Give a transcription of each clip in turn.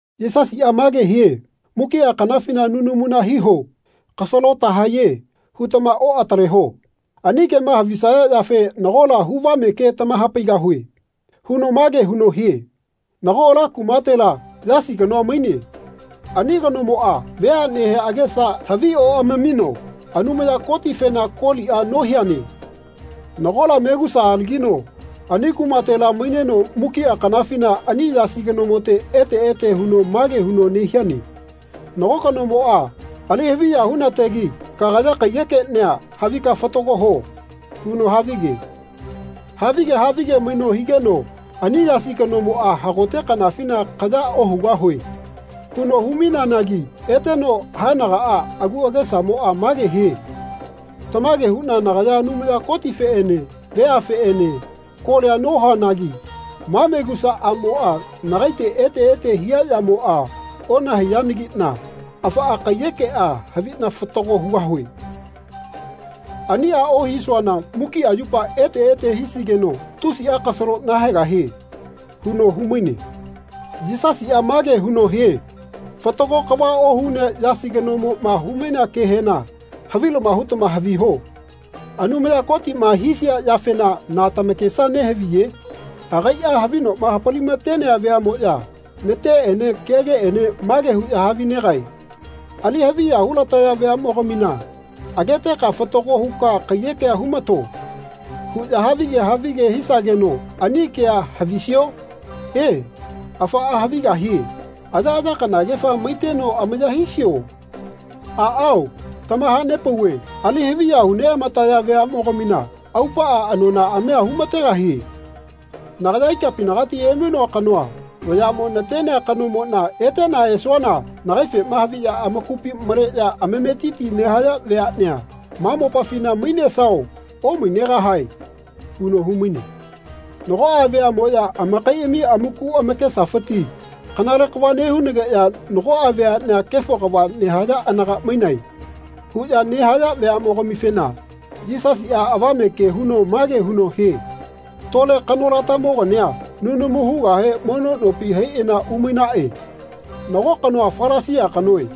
Yisasiꞌa mage hie “Mukiꞌa kanafina nunamuna hiho. ‘Kasalo tahae.’ hutama oꞌataleho. Ani kema havisaya yafe nagola huvame ke tamahapaigahue.” huno mage huno hie “Nago ala kumatela Yasi kanoa maine. Ani kanomoꞌa veaꞌnehe agesa havioꞌamamino Anumaya Kotifena koliꞌa nohiane. Nagola megusa alagino ani kumatela maineno mukiꞌa kanafina ani Yasi kanomote ete ete huno mage huno nehiane ‘Nago kanomoꞌa ali-haviya hunategi kagaya kaiyekeꞌnia havika fatago ho.’ huno havige. Havige havige maino higeno ani Yasi kanomoꞌa hagote kanafina ‘Kaya ohugahue.’ huno hu-maineanagi eteno haenagaꞌa agu agesamoꞌa mage hie ‘Tamage huꞌna nagaya Anumaya Kotifeꞌene veafeꞌene kolia nohuanagi ma megusa aꞌmoꞌa nagaite ete ete hia yamoꞌa onahaiyanagiꞌna afaꞌa kaiyekeꞌa haviꞌna fatago hugahue. Aniꞌa ohisuana mukiꞌa yupa ete ete hisigeno tusiꞌa kasalo nahaegahie.’ huno humaine.” Yisasiꞌa mage huno hie “Fatago kava ohunea Yasi kanomoꞌma humainea kehena havilama hutama haviho. Anumaya Kotiꞌma hisia yafena na tamakesa nehaviye? Agaiꞌa havinoꞌma hapalimatenea veaꞌmoꞌya nateꞌene kegeꞌene mage huꞌya havinegae ‘Ali-haviya hulataya veaꞌmogamina ageteka fatago huka kaiyekea humato.’ huꞌya havige havige hisageno ani kea havisio? E, afaꞌa havigahie. Ayaꞌaya kanagefa maiteno amaya hisio? Aꞌao tamahanepauve ali-haviya hu-neꞌamataya veaꞌmogamina aupaꞌa anonaꞌamia humategahie. Nagaya ikapinagati emainoa kanoa vayaꞌmo natenea kanomoꞌna eteꞌna esuana nagaifema haviꞌya amakupi maleꞌya ametiti nehaya veaꞌnea ma mopafina mainesao omainegahao?” huno humaine. Nagoꞌa veaꞌmoꞌya amakaiꞌami amaku amakesafiti “Kanale kava nehunageꞌya nagoꞌa veaꞌnea kefo kava nehaya anaga mainae.” huꞌya nehaya veaꞌmogamifena Yisasiꞌa avame ke huno mage huno hie “Tole kanolatamogania nunamu hugahe mono nopi haiꞌana umainaꞌe. Nago kanoa Falasia kanoe.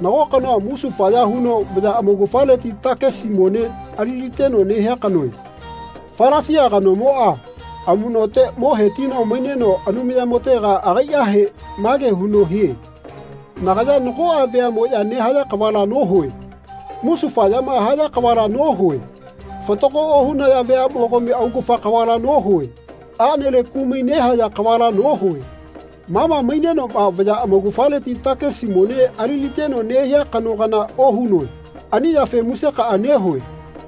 Nago kanoa musufaya huno vaya amaugafaleti takisi mone aliliteno nehia kanoe. Falasia kanomoꞌa amuꞌnote mo hetino maineno Anumayamotega agaiꞌahe mage huno hie ‘Nagaya nagoꞌa veaꞌmoꞌya nehaya kavala nohue. Musufayama haya kavala nohue. Fatago ohunaya veaꞌmogami augafa kavala nohue. Aꞌnele kumai nehaya kavala nohue. Mama mainenoꞌma vaya amaugafaleti takisi mone aliliteno nehia kano kana ohunoe. Ani yafe musekaꞌa nehue.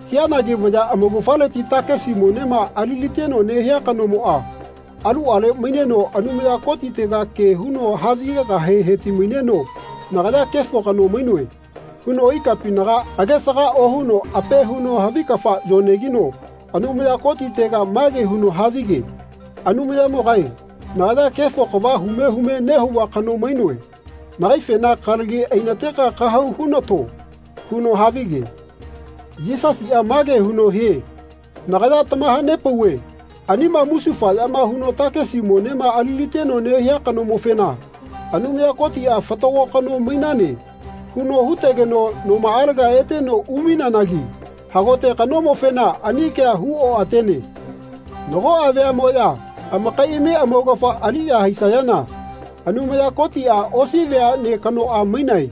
Hianagi vaya amaugafaleti takisi monema aliliteno nehia kanomoꞌa aluꞌale maineno Anumaya Kotitega ke huno havigegahe hetimaineno ‘Nagaya kefo kano mainoe.’ huno ikapinaga agesaga ohuno ape huno havi kafa yonegino Anumaya Kotitega mage huno havige ‘Anumayamogae nagaya kefo kava hume hume nehauva kano mainoe. Nagaifena kalagi ainateka kahau hunato.’ huno havige.” Yisasiꞌa mage huno hie “Nagaya tamahanepauve anima musufayama huno takisi monema aliliteno nehia kanomofena Anumaya Kotiꞌa ‘Fatago kano mainane.’ huno hutegeno nomaꞌalega eteno umaineanagi hagote kanomofena ani kea hu oꞌatene. Nagoꞌa veaꞌmoꞌya amakaiꞌami amaugafa aliꞌya haisayana Anumaya Kotiꞌa ‘Osi veaꞌne kanoꞌa mainae.’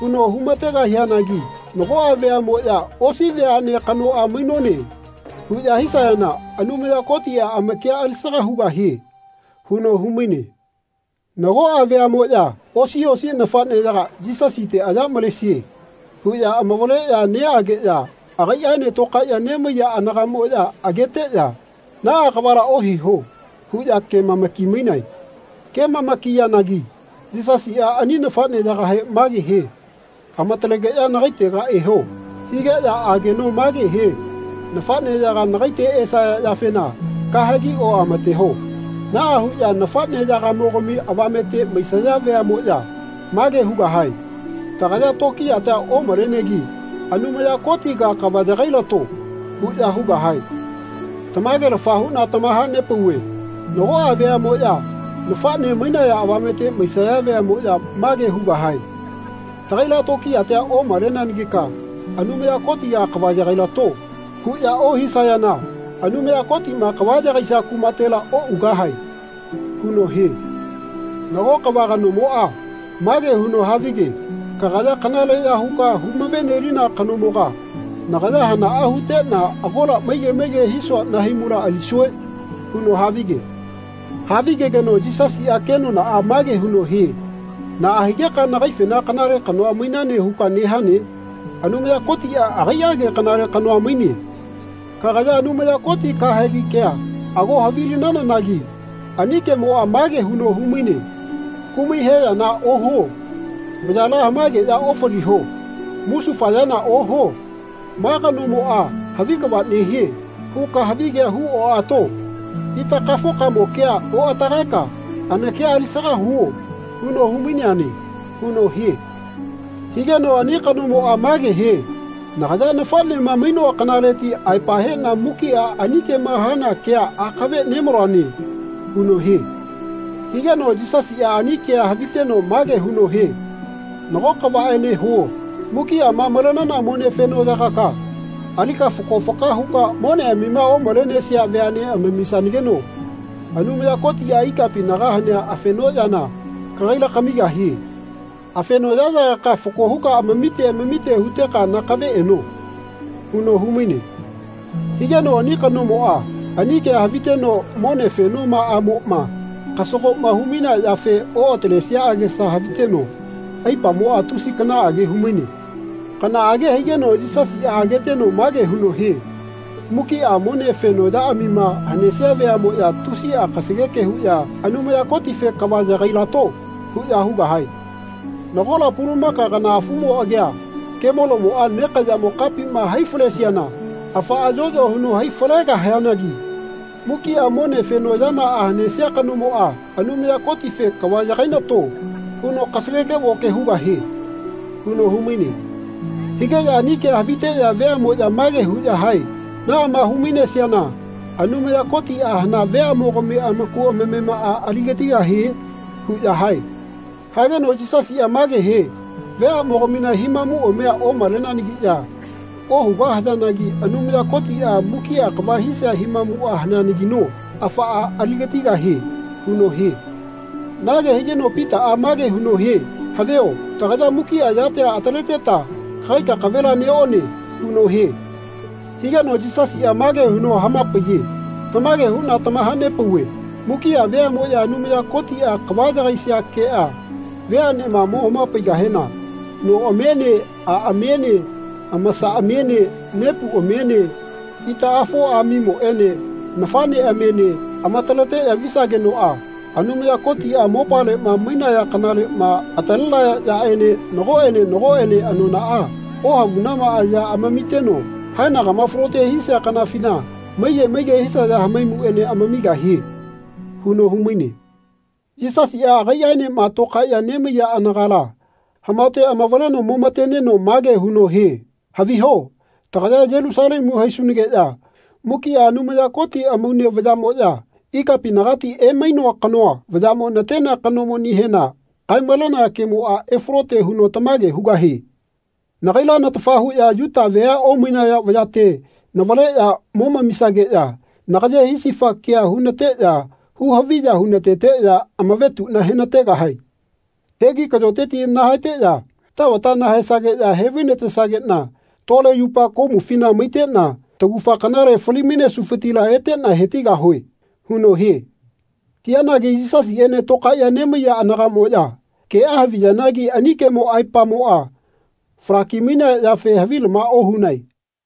huno humategahianagi nagoꞌa veaꞌmoꞌya ‘Osi veaꞌne kanoꞌa mainone.’ huꞌya hisayana Anumaya Kotiꞌa amakia alisaga hugahie.” huno humaine. Nagoꞌa veaꞌmoꞌya osi osi nafaꞌneyaga Yisasite “Aya malesie.” huꞌya amavaleꞌya neꞌageꞌya agaiꞌaene tokaeꞌya nemaiya anagamoꞌya ageteꞌya “Naꞌa kavala ohiho.” huꞌya kemamaki-mainae. Kemamakiyanagi Yisasiꞌa ani nafaꞌneyagahe mage hie “Amatalegeꞌya nagaitega eho.” higeꞌya ageno mage hie “Nafaꞌneyaga nagaite esaya yafena kahegi oꞌamateho. Naꞌa huꞌya nafaꞌnemogami avamete maisaya veaꞌmoꞌya mage hugahae ‘Tagaya tokiyatia omalenegi Anumaya Kotiga kava yagailato.’ huꞌya hugahae. Tamagelafa huꞌna tamahanepauve nagoꞌa veaꞌmoꞌya nafaꞌne mainaya avamete maisaya veaꞌmoꞌya mage hugahae ‘Tagaila tokiyatia omaleanagika Anumaya Kotiga kava yagailato.’ huꞌya ohisayana Anumaya Kotiꞌma kava yagaisia kumatela oꞌugahae.” huno hie. Nago kava kanomoꞌa mage huno havige “Kagaya kanaleꞌya huka humavenelina kanomoga nagaya hanaꞌa huteꞌna agola maige maige hisua nahaimula alisue?” huno havige. Havigegeno Yisasiꞌa kenonaꞌa mage huno hie “Naꞌa higeka nagaifena kanale kanoa mainane huka nehane? Anumaya Kotiꞌa agaiꞌage kanale kanoa maine. Kagaya Anumaya Koti kahegi kea ago havilinanagi ani kemoꞌa mage huno humaine ‘Kumai he yana ohuo. Vayala hamaegeꞌya ofaliho. Musufayana ohuo. ‘Ma kanomoꞌa havi kava nehie.’ huka havigea huoꞌato. Itakafokamo kea oꞌatagaeka anakia alisaga huo.’ huno humaineane.” huno hie. Higeno ani kanomoꞌa mage hie “Nagaya nafaꞌnema mainoa kanaleti aepa heꞌna mukiꞌa ani kema hana kea akave nemaloane.” huno hie. Higeno Yisasiꞌa ani kea haviteno mage huno hie “Nago kavaꞌene huo. Mukiꞌama malenana mone fenoꞌyaꞌyagaka alika fako faka huka moneꞌamima omalenesia veaꞌne amamisanageno Anumaya Kotiꞌa ikapinaga hanea afenoꞌyana kagaila kamigahie. Afenoꞌyaꞌyagaka fako huka amamite amamite huteka nakave eno.” huno humaine. Higeno ani kanomoꞌa ani kea haviteno mone fenomaꞌamoꞌma kasagoꞌma humainea yafe oꞌatalesia agesa haviteno aipamoꞌa tusi kanaꞌage humaine. Kanaꞌage higeno Yisasiꞌa ageteno mage huno hie “Mukiꞌa mone fenoꞌyaꞌamima hanesia veaꞌmoꞌya tusiꞌa kasageke huꞌya ‘Anumaya Kotife kava yagailato.’ huꞌya hugahae. Nagola pulumaka kana afumo agia kemolomoꞌa nekaꞌyamo kapima hai falesiana afaꞌa yoꞌyo huno hai falegahianagi mukiꞌa mone fenoꞌyamaꞌa hanesia kanomoꞌa Anumaya Kotife ‘Kava yagainato.’ huno kasageke-voke hugahie.” huno humaine. Higeꞌya ani kea haviteꞌya veaꞌmoꞌya mage huꞌya hae “Naꞌama hu-mainesiana Anumaya Kotiꞌa hana veaꞌmogami amaku amamemaꞌa aligatigahie?” huꞌya hae. Hageno Yisasiꞌa mage hie “Veaꞌmogamina himamuꞌamia omaleneanagiꞌya ohugahayanagi Anumaya Kotiꞌa mukiꞌa kava hisia himamuꞌa haneanagino afaꞌa aligatigahie.” huno hie. Nage higeno Pitaꞌa mage huno hie “Havio tagaya mukiꞌa yatia ataleteta kagai kakavela neꞌone.” huno hie. Higeno Yisasiꞌa mage huno hamapaiye “Tamage huꞌna tamahanepauve mukiꞌa veaꞌmoꞌya Anumaya Kotiꞌa kava yagaisia keꞌa veaꞌnema mo hamapaigahena noꞌamiene aꞌamiene amasaꞌamiene nepuꞌamiene itaꞌafoꞌamimoꞌene nafaꞌneꞌamiene amataleꞌya visagenoꞌa Anumaya Kotiꞌa mopaleꞌma mainaya kanaleꞌma atalenaya yaꞌene nagoꞌene nagoꞌene anonaꞌa ohavunamaꞌa ya amamiteno haenagama falote hisia kanafina maige maige hisaya hamaimuꞌene amamigahie.” huno humaine. Yisasiꞌa agaiꞌaenema tokaeꞌya nemaiya anagala hamaote amavaleno momateneno mage huno hie “Haviho tagaya Yelusalemu haisunageꞌya mukiꞌa Anumaya Koti amaune vayaꞌmoꞌya ikapinagati emainoa kanoa vayaꞌmo natenea kanomonihema kae-malenaya kemoꞌa efalote huno tamage hugahie. Nagaila natafa huꞌya Yuta vea omainaya vayate navaleꞌya momamisageꞌya nagaye hisifa kea hunateꞌya hu-haviya hunateteꞌya amavetuꞌna henategahae. Hegi kaꞌyoteti nahaeteꞌya tavata nahaesageꞌya hevainatesageꞌna tole yupa komufina maiteꞌna tagufa kanale fali-mainesufitila eteꞌna hetigahue.” huno hie. Hianagi Yisasiꞌene tokaeꞌya nemaiya anagaꞌmoꞌya keꞌa haviyanagi ani kemo aepamoꞌa falaki-mainea yafe havilama ohunae.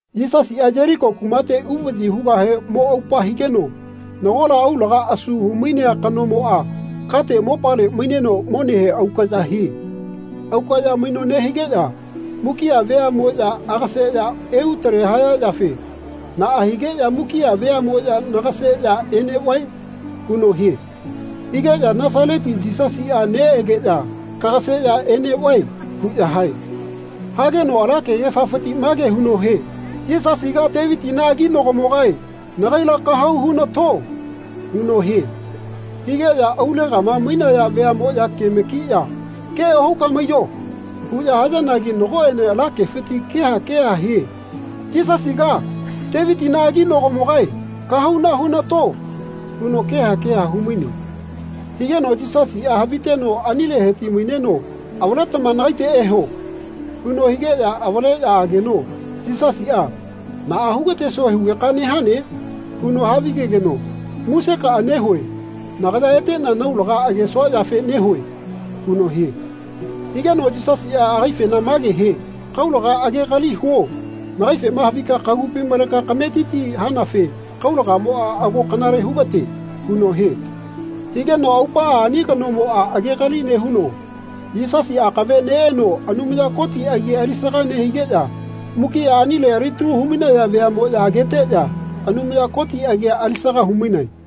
Yisasiꞌa Yeliko kumate uvaꞌyi hugahe mo aupa higeno nagola aulaga asu humainea kanomoꞌa kate mopale maineno monehe aukaꞌya hie. Aukaꞌya maino nehigeꞌya mukiꞌa veaꞌmoꞌya agaseꞌya eutele haya yafe “Naꞌa higeꞌya mukiꞌa veaꞌmoꞌya nagaseꞌya eneꞌvae?” huno hie. Higeꞌya “Nasaleti Yisasiꞌa neꞌegeꞌya kagaseꞌya eneꞌvae.” huꞌya hae. Hageno ala kegefafiti mage huno hie “Yisasiga Tevitina aginagomogae nagaila kahauna hunato.” huno hie. Higeꞌya aulegama mainaya veaꞌmoꞌya kemakiꞌya “Ke ohuka maiyo.” huꞌya hayanagi nagoꞌene ala kefiti keha keha hie “Yisasiga, Tevitina aginagomogae kahauna hunato.” huno keha keha humaine. Higeno Yisasiꞌa haviteno anile heti-maineno “Avaletama nagaite eho.” huno higeꞌya avaleꞌya ageno Yisasiꞌa “Naꞌa hugatesue hugeka nehane?” huno havigegeno “Musekaꞌa nehue nagaya eteꞌna naulaga agesua yafe nehue.” huno hie. Higeno Yisasiꞌa agaifena mage hie “Kaulaga agegali huo. Nagaifema havika kagupi maleka kametiti hanafe kaulagamoꞌa ago kanale hugate.” huno hie. Higeno aupaꞌa ani kanomoꞌa agegali nehuno Yisasi akave neꞌeno Anumaya Koti agi alisaga nehigeꞌya mukiꞌa anile alitalu humainaya veaꞌmoꞌya ageteꞌya Anumaya Koti agia alisaga humainae.